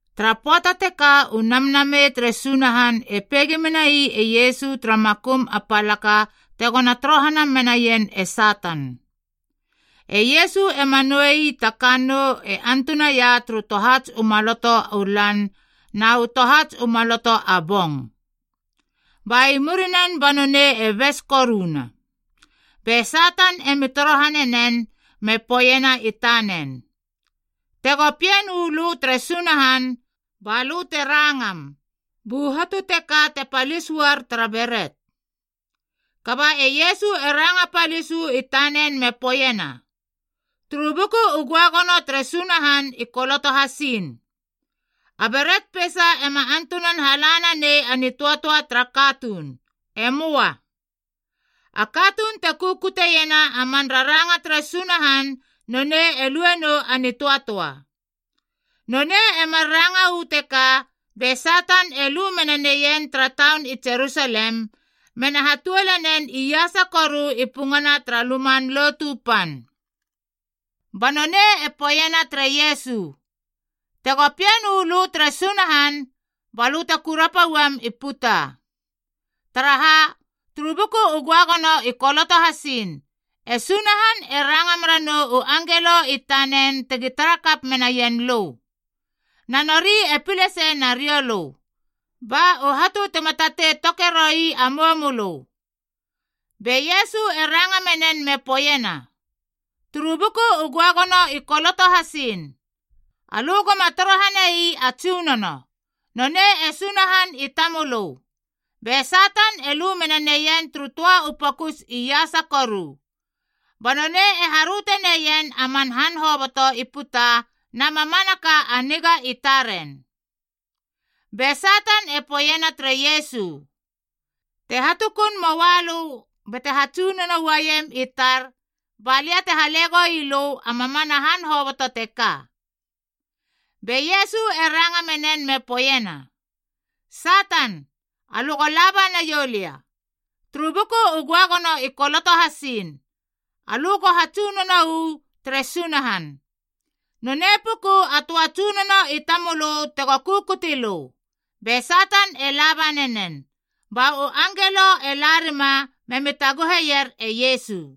Tara pöata teka u Namnamei tere Sunahan e peigi menai e Iesu tara makum a palaka tegona torohana menaien e Satan. E Iesu ema nouei ta kannou e antunaia turu tohats u maloto u lan na u tohats u maloto a bong. Ba i murinen ba nonei e bes koruna. Be Satan emi torohane nen me poeiena i tanen, “Tego Pien uu lö tere Sunahan, ba lö te rangam, bu hatu teka te palis uar tara beret.” Kaba e Iesu e ranga palis uu i tanen me poeiena, “Turu Buku u Göagono tere Sunahan i koloto hasiin, ‘A beret peisa ema antunan hala nanei a nitöatöa tara katuun. E möa. A katuun te kukutiena a man raranga tere Sunahan nonei e luenou a nitöatöa.’” Nonei e mar ranga uu teka, be Satan e lu mena neien tara taun i Jerusalem, mena hatuole nen iasa koru i pungana tara Luman Lotu Pan. Ba nonei e poeiena tere Iesu, “Tego Pien uu lö tere Sunahan, ba lö te kurapa uam i puta. Taraha, turu Buku u Göagono i koloto hasiin, ‘E Sunahan e ranga mera nou u angelo i tanen tegi tara kap menaien lö. Na nori e pile sei nariou lö, ba u hatu tema tatei toke roi a mou mölö.’” Be Iesu e ranga menen me poeiena, “Turu Buku u Göagono i koloto hasiin, ‘Alö goma torohanei a Tsunono. Nonei e Sunahan i tamölö.’” Be Satan e lu mena neien turu töa u pokus iasa koru. Ba nonei e haröte neien a man han hoboto i puta na mamanaka a niga i taren. Be Satan e poeiena tere Iesu, “Te hatukun moa lö bate hatsunono uaiem i tar, ba lia te hale goi lö a mamana han hoboto teka.” Be Iesu e ranga menen me poeiena, “Satan, alö go laba naiou lia! Turu Buku u Göagono i koloto hasiin, ‘Alö go hatsunono uu tere Sunahan. Nonei puku a töa a Tsunono i tamölö tego kukuti lö.’” Be Satan e laba nanen. Ba u angelo e la rima memi taguheier e Iesu.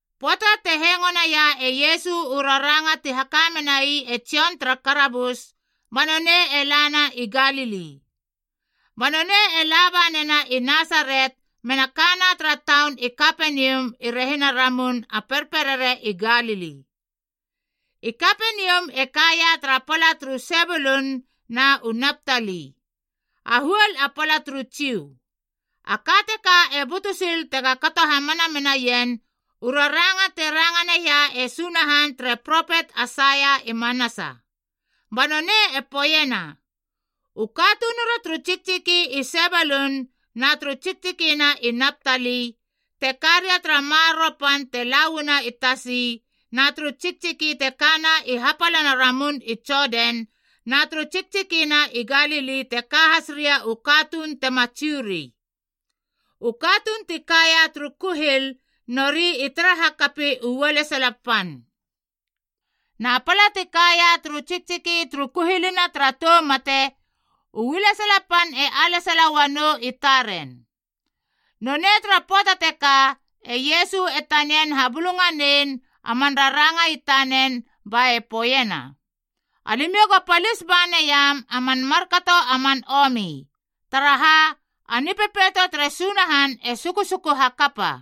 Pöata te hengo naia e Iesu u raranga ti haka menai e Jon tara karabus, ba nonei e lana i Galili. Ba nonei e laba nena i Nasaret mena kana tara taun i Kapenium i rehina a Ramun a Perperere i Galili.a I Kapenium e kaia tara pala turu Sebulun na u Naptali, a huol a pala turu Jiu. A ka teka e butu sil tega kato hamana menaien u raranga te ranga naia e Sunahan tere propet Aisaia i manasa. Ba nonei e poeiena, “U katunura turu tsiktsiki i Sebulun na turu tsiktsikina i Naptali, te ka ria tara maroro pan te la uana i tasi na turu tsiktsiki te kana i hapalana ramun i Jodan, na turu tsiktsikina i Galili te ka has ria u katuun tema Jiu ri. U katuun ti kaia turu kuhil, nori i tara hakapi u ualesala pan! Na pala ti kaia turu tsiktsiki turu kuhilina tara tou mate, u ualesala pan e alesala uanou i taren.” Nonei tara pöata teka, e Iesu e tanian habulunganein a man raranga i tanen ba e poeiena, “Alimiou go palis ba naiam a man markato a man omi! Taraha, a Nipepeito tere Sunahan e sukusuku hakapa.”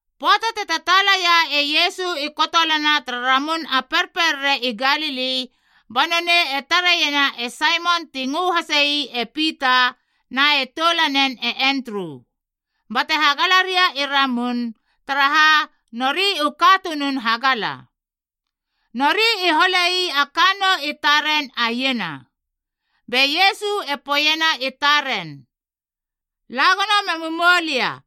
Pöata te tataalaia e Iesu i kotolana tara Ramun a Perperere i Galili, ba nonei e tareiena e Saimon ti ngö hase ii e Pita na e toulanen e Endru, bate hagala ria i ramun, taraha nori u katunun hagala. Nori i holei a kannou i taren a iena. Be Iesu e poeiena i taren, “La gono memu moulia,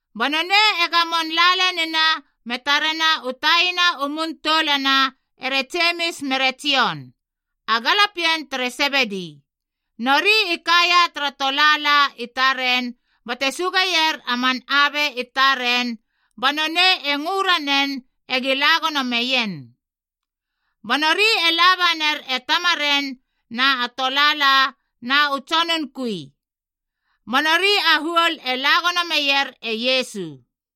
Ba nonei e gamon la lenina me tarena u taina u mun toulana ere Jemis mere Jon, a galapien tere Sebedi. Nori i kaia tara tolaalac i taren bate sugeier a man abe i taren, ba nonei e ngö ranen egi la gono meien. Ba nori e laba ner e tamaren na tolaala na u tsonun kui. Ba nori a huol e la gono meier e Iesu.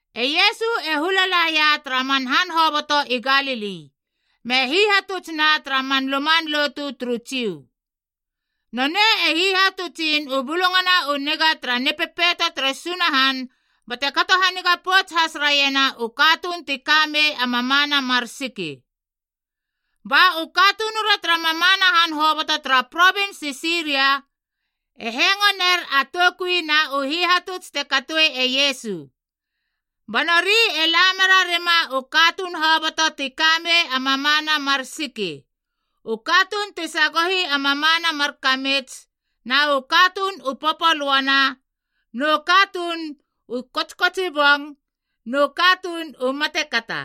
E Iesu e hula laia tara man han hoboto i Galili, me hihatutsna tara man luman lotu turu Jiu. Nonei e hihatutsin u Bulungana u Niga tara Nipepeito tere Sunahan bate kato haniga pouts has raiena u katuun ti ka mei a mamana mar siki. Ba u katunura tara mamana han hoboto tara provins i Siria e hengo ner a toukui na u hihatuts te katoe e Iesu. Ba nori e la merarima u katuun hoboto ti ka mei a mamana mar siki, u katuun ti sagohi a mamana mar kamits, na u katuun u popolöana, nu katuun u kotskotsibong, nu katuun u matekata.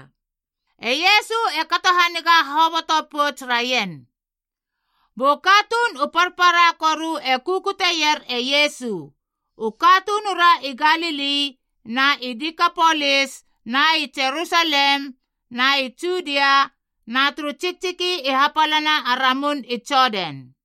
E Iesu e kato haniga hoboto pouts raien. Bu katuun u parpara koru e kukutier e Iesu: u katunura i Galili na i Dikapolis na i Jerusalem na i Judia na turu tsiktsiki i hapalana a ramun i Jodan.